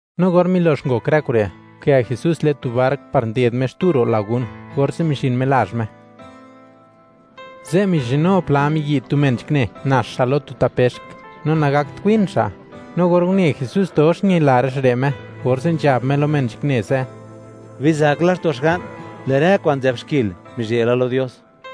No or milo'x ngok rë kure', nkë Jesús le'n tu bark par nded Me xtu ro' lagún, orze' mizhin Me lazh Me. Ze' mizhinu pla miyi' tu men nzhakne nax xa' lo tu tapexk, no nagakt win xa'; no or une Jesús dox ñila rë xa' re' Me, orze' nzhab Me lo men nzhakne ze': ―Bizak laxto' xga'n; lë' rë kwa'n nzë'b xkil mizhe' la lo Dios.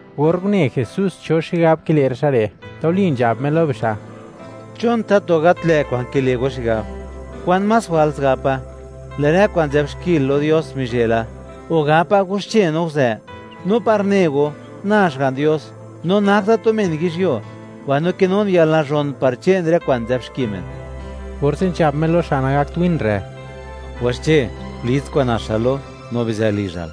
Or une Jesús cho xigab kile' rë xa' re', tuli nzhab Me lo bixa': ―¿Chon tatu gat lë' kwa'n kile' go xigab? ¿Kwan más jwals gapa?: “Lë' rë kwa'n nzë'b xkil lo Dios mizhe' la”, o gapa: “Waxche, no nguzë.” No par ne go, na Xga'n Dios, no nak da tu men yizhyuo, mbaino kinun yalnazhon par che'n rë kwa'n nzë'b xki men. Orze' nzhab Me lo xa' nagakt win re': ―Waxche, gulits kwa'n naxal lo, no bizë lizhal.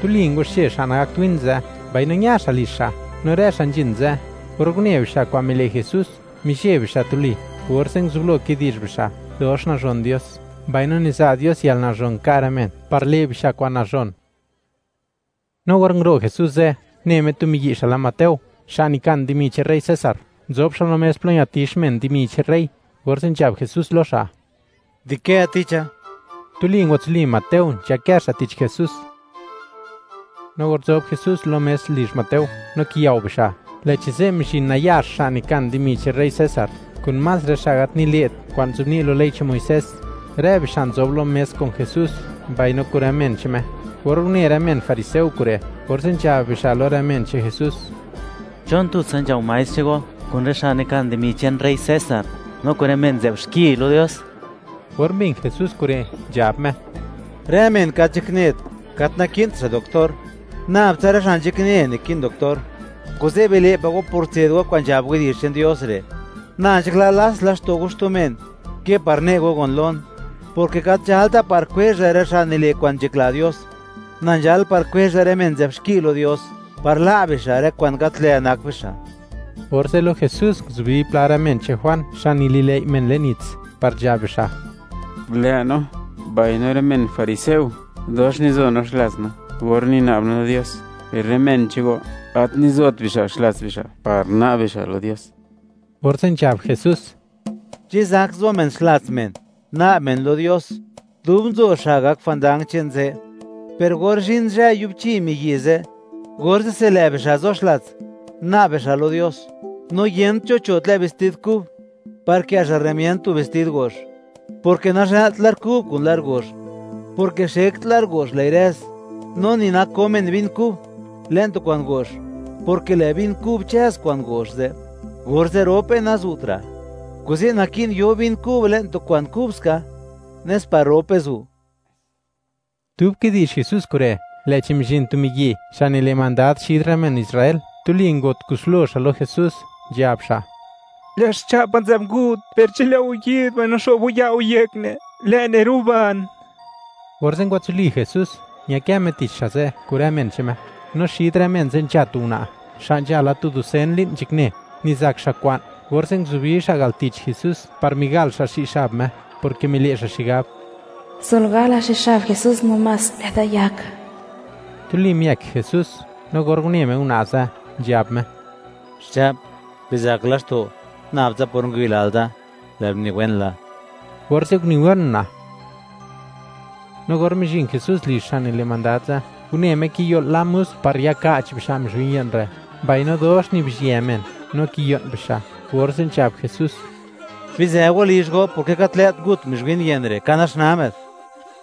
Tuli ngwaxche xa' nagakt win ze', mbaino ña xa' lizh xa', no rë xa' nzhin ze', or une bixa' kwa'n mile' Jesús, mizheb bixa' tuli, orze' nguzublo kidi'zh bixa', dox nazhon Dios mbaino niza' Dios yalnazhon nka' rë men par le' bixa' kwa'n nazhon. No or nguro' Jesús ze', une Me tu miyi' xa' lë Mateo, xa' nikan dimi che'n rey César, nzob xa' lo mes plo ñatix men dimi che'n rey; orze' nzhab Jesús lo xa': ―Dikë ticha. Tuli ngwatsuli Mateo, nzhakë xa' tich Jesús. No or nzob Jesús lo mes lizh Mateo, no kiyao bixa', lë'chi ze' mizhin nayax xa' nikan dimi che'n rey César, kun más rë xa' gat nile't kwa'n nzobni' lo ley che'n Muisés; rë bixa' nzob lo mes kun Jesús, mbaino kun rë men che'n Me. Or une rë men fariseo kure', orze' nzhab bixa' lo rë men che'n Jesús: ―¿Chon tutsa nzhao maestr che'n go kun rë xa' nikan dimi che'n rey César, no kun rë men nzë'b xki lo Dios? Or mbin Jesús kure', nzhab Me: ―Rë men gat nzhaknet, gat naki'nt xa' doctor, nab tsa rë xa' nzhakne naki'n doctor. Kuze' bile' pa' go por tse'd go kwa'n nzhab widi'zh che'n Dios re': “Na nzhakla, lats laxto' go xtu men, ke par ne' go gon lon”, porke gat nzhalta par kwezha rë xa' nile' kwa'n nzhakla Dios; na nzhal par kwezha rë men nzë'b xki lo Dios, par la' bixa' rë kwa'n gat lë' nak bixa'. Orze' lo Jesús nguzubi pla rë men che'n Juan xa' nili'lëi' men le'n nits, par nzhab bixa': ―Lë' no, mbaino rë men fariseo, dox nizo no xlats no or nina'b no lo Dios; per rë men che'n go, gat nizot bixa' xlats bixa' par na'b bixa' lo Dios. Orze' nzhab Jesús: ―¿Chi zak zo men xlats men, na'b men lo Dios, dub nzo xa' gak jwandang che'n ze'? Per or zhin zhë yubchi miyi' ze', orze'se lë' bixa' zo xlats, na'b bixa' lo Dios. No yent cho cho' tlë' vestid kub par kë' xa' rëmiënd tu vestid go'x; porke nazhëlt lar kub kun lar go'x, porke xekt lar go'x, lë'i rëz; no ni nako men vin kub le'n tu kwa'n go'x; porke lë' vin kub chëz kwa'n go'x ze', orze' rope nazu'tra'. Kuze' naki'n yo vin kub le'n tu kwa'n kubska, nes par rope zu'. Dub kidi'zh Jesús kure', lë'chi mizhin tu miyi' xa' nile' mandad xid rë men Israel, tuli ngo't kuslo xa' lo Jesús, nzhab xa': ―Lë' xcha'pa nzë'b ngut, per chi lë' go yi'd mbaino xo'b go ya' go yek ne', lë' ne' ruban. Orze' ngwatsuli Jesús, ñakë Me tich xa' ze' kun rë men che'n Me. No xid rë men ze' nzha tu una', xa' nzhala tu dusen li'n nzhakne, nizak xa' kwa'n, orze' nguzubi xa' al tich Jesús par migal xa' xi' xab Me, porke mile' xa' xigab: “Sol gala xi' xab Jesús namás, lë'da yak.” Tuli miëk Jesús, no or une Me una' ze', nzhab Me: ―Xcha'p, bizak laxto'; nab tsa por ngwayilal da, lë'l niwen la. Orze', uniwen una'. No or mizhin Jesús lizh xa' nile' mandad ze', une Me kiyo'l la musk par yaka'ch bixa' mizhwin ye'n re', mbaino dox nibizhyë men, no kiyo'n bixa', orze' nzhab Jesús: ―Bizë go lizh go, porke gat lë't ngut mizhwin ye'n re', ka naxnaa më'd.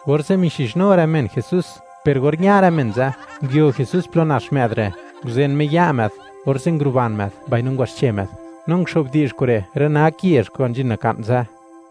Orze' mixizhnu rë men Jesús, per or ña rë men ze', nguio Jesús plo nax më'd re', nguzen Me ya' më'd, orze' nguruban më'd mbaino ngwaxche më'd, no nguxo'bdi'zh kure' rë nak yezh kwa'n nzhin naka'n ze'.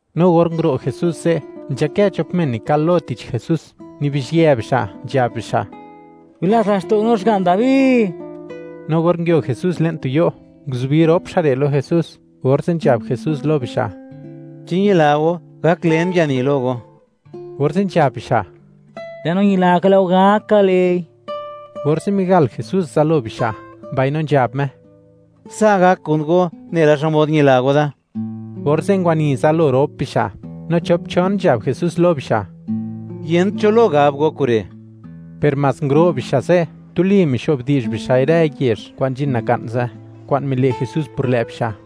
No or nguro' Jesús ze', nzhakë chop men nikal lo tich Jesús, nibizhyë bixa' nzhab bixa': ―¡Bilats laxto' no, xga'n Dabi! No or nguio Jesús le'n tu yo', nguzubi rop xa' re' lo Jesús, orze' nzhab Jesús lo bixa': ―¿Chi ñila go, gak len yani lo go? Orze' nzhab bixa': ―Lë' no ñila ka, lë' go gak ka le'i. Orze' migal Jesús zalo bixa', mbaino nzhab Me: ―Sa' gak kun go nela xmod ñila go da. Orze' ngwani zalo rop bixa', no chop-chon nzhab Jesús lo bixa': ―Yent cho lo gab go kure'. Per mas nguro' bixa' ze', tuli mixo'b di'zh bixa'i rë yezh kwa'n nzhin naka'n ze', kwa'n mile' Jesús por lë' bixa'.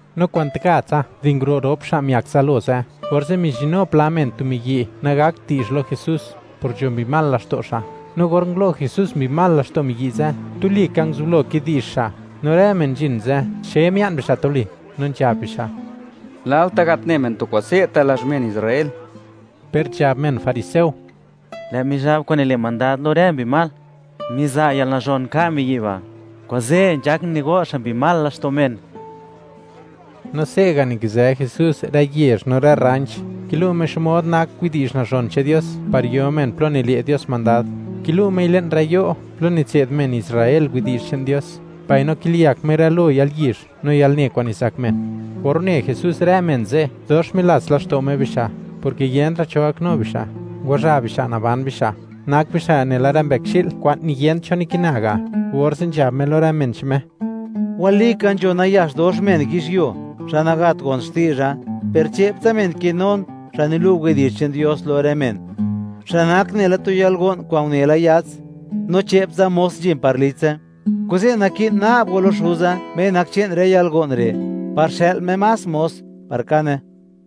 No kwanti gatsa di nguro' rop xa' miak zalo ze', orze' mizhinnu pla men tu miyi' nagakt di'zh lo Jesús, por nzho mbi mal laxto' xa', no or ngulo' Jesús mbi mal laxto' miyi' ze', tuli ka nguzublo kidi'zh xa', no rë men nzhin ze', xe mia'n bixa' tuli, no nzhab bixa': ―¡Lalta' gat ne men tu kwa'n se'ta' lazh men Israel! Per nzhab men fariseo: ―Lë' Mizhab kwa'n nile' mandad lo rë mbi mal, miza' yalnazhon nka' miyi' ba', kuze' nzhak nigo' xa' mbi mal laxto' men. No se'ga' nikizë Jesús rë yezh no rë rranch, kilu' Me xmod nak widi'zh nazhon che'n Dios par yo men plo nile' Dios mandad, kilu' Mei le'n rë yo' plo nitse'd men Israel widi'zh che'n Dios, mbaino kiliyak Me rë lo yalyizh no yalne kwa'n nizak men. Or une Jesús rë men ze', dox milats laxto' Me bixa', porke yentra' cho gaknu bixa', ngwazha bixa' naban bixa', nak bixa' nela rë mbëkxi'l kwa'n niyent cho nikina ga', orze' nzhab Me lo rë men che'n Me: ―Walika, nzho nayax dox men yizhyuo, xa' nagat gon xti'zha, per che'ptsa men kinun, xa' nilu' widi'zh che'n Dios lo rë men, xa' nak nela tu yalgo'n kwa'n une la yats, no che'ptsa mos nzhin par litse. Kuze', naki'n na'b go lo Xuza, Me nak che'n rë yalgo'n re', par xë'l Me más mos par kane.